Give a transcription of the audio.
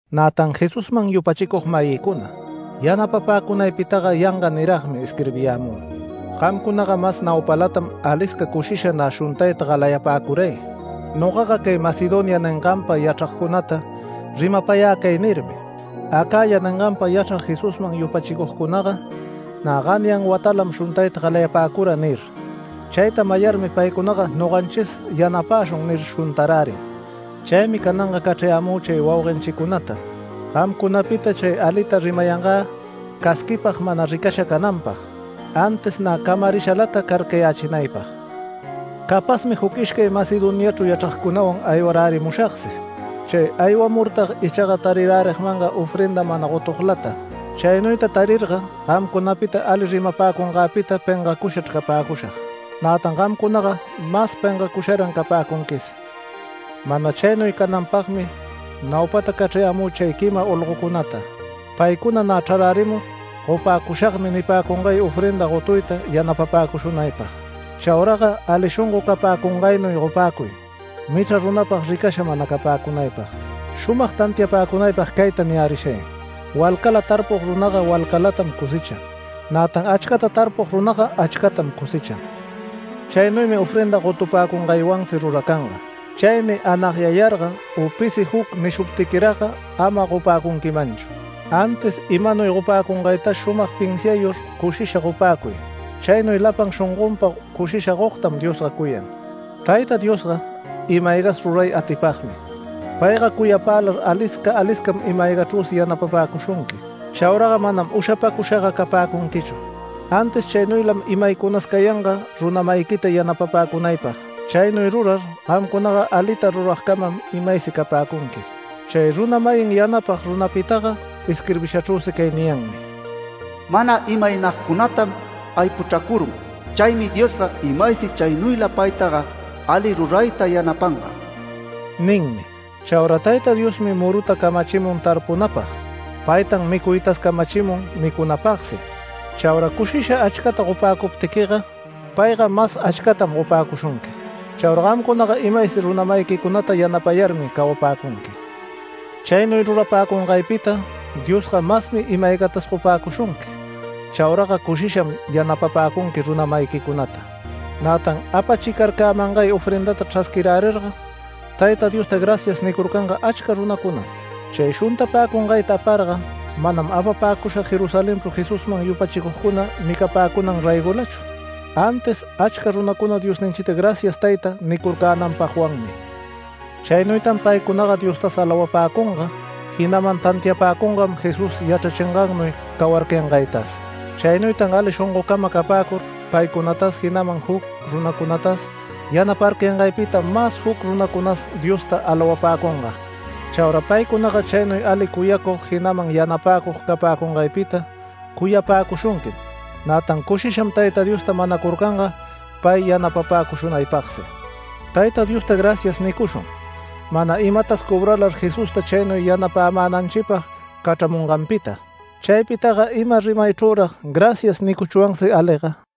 Nätan Jesusman yupachicug-mayinchicuna yanapapäcunaypitaga yanga niragmi isquirbiyämü. Gamcunaga mas naupalatam alisca cushisha nä shuntayta galayapäcuray. Nogaga cay Macedonia ninganpa yachragcunata rimapayä cay nirmi: “Acaya ninganpa yachrag Jesusman yupachicugcunaga nä ganyan watalatam shuntayta galayapäcura” nir. Chayta mayarmi paycunaga “Noganchis yanapäshun” nir shuntarärin. Chaymi cananga cachrayämü chay wauguenchicunata gamcunapita chay alita rimayangä casquipag mana ricasha cananpag, antis nä camarishalata carcayächinaypag. Capazmi juc ishcay Macedoniachru yachragcunawan aywarärimushagsi. Chay aywamurtag ichaga tarirärigmanga ofrenda mana gotuglata. Chaynuyta tarirga gamcunapita ali rimapäcungäpita pengacushachr capäcushag, nätan gamcunaga mas pengacusharan capäcunquis. Mana chaynuy cananpagmi, naupata cachrayämü chay quima olgocunata paycuna nä chrararärimur “Gopäcushagmi” nipäcungay ofrenda gotuyta yanapapäcushunaypag. Chauraga ali shongo capäcungaynuy gopäcuy michra runapag ricasha mana capäcunaypag. Shumag tantiapäcunaypag cayta niyärishay: “Walcala tarpug runaga walcalatam cosechan, nätan achcata tarpug runaga achcatam cosechan”. Chaynuymi ofrenda gotupäcungaywansi ruracanga. Chaymi anagyayarga u pisi juc nishuptiquiragga ama gopäcunquimanchu, antis imanuy gopäcunaytas shumag pinsiayur cushisha gopäcuy. Chaynuy lapan shongonpa cushisha gogtam Diosga cuyan. Tayta Diosga ima-aygas ruray atipagmi. Payga cuyapälar alisca aliscam ima-aygachrüsi yanapapäcushunqui. Chauraga manam ushapacushaga capäcunquichu. Antis chaynuylam imaycunas cayanga runa-mayiquita yanapapäcunaypag. Chaynuy rurar gamcunaga alita ruragcamam imaysi capäcunqui. Chay runa-mayin yanapag runapitaga isquirbishachrüsi cay niyanmi: “Mana imaynagcunatam aypuchracurun, chaymi Diosga imaysi chaynuyla paytaga ali rurayta yanapanga” ninmi. Chaura Tayta Diosmi muruta camachimun tarpunapag, paytan micuytas camachimun micunapagsi. Chaura cushisha achcata gopäcuptiquiga, payga mas achcatam gopäcushunqui. Chaura gamcunaga imaysi runa-mayiquicunata yanapayarmi cawapäcunqui. Chaynuy rurapäcungaypita Diosga masmi ima-aygatas gopäcushunqui. Chauraga cushisham yanapapäcunqui runa-mayiquicunata. Nätan apachicarcämangay ofrendata chrasquirärirga Tayta Diosta “Gracias” nicurcanga achca runacunam. Chay shuntapäcungayta aparga manam apapäcushag Jerusalenchru Jesusman yupachicugcuna micapäcunan raygolachu, antis achca runacuna Diosninchita “Gracias Tayta” nicurcänanpagwanmi. Chaynuytan paycunaga Diostas alawapäcunga, jinaman tantiapäcungam Jesús yachrachingannuy cawarcayangaytas. Chaynuytan ali shongocama capäcur paycunatas, jinaman juc runacunatas yanaparcayangaypita mas juc runacunas Diosta alawapäcunga. Chaura paycunaga chaynuy ali cuyacug, jinaman yanapäcug capäcungaypita cuyapäcushunquim. Nätan cushisham Tayta Diosta manacurcanga pay yanapapäcushunaypagsi. Tayta Diosta “Gracias” nicushun, mana imatas cobralar Jesusta chaynuy yanapämänanchipag cachramunganpita. ¡Chaypitaga ima rimaychrürag “Gracias” nicuchwansi aliga!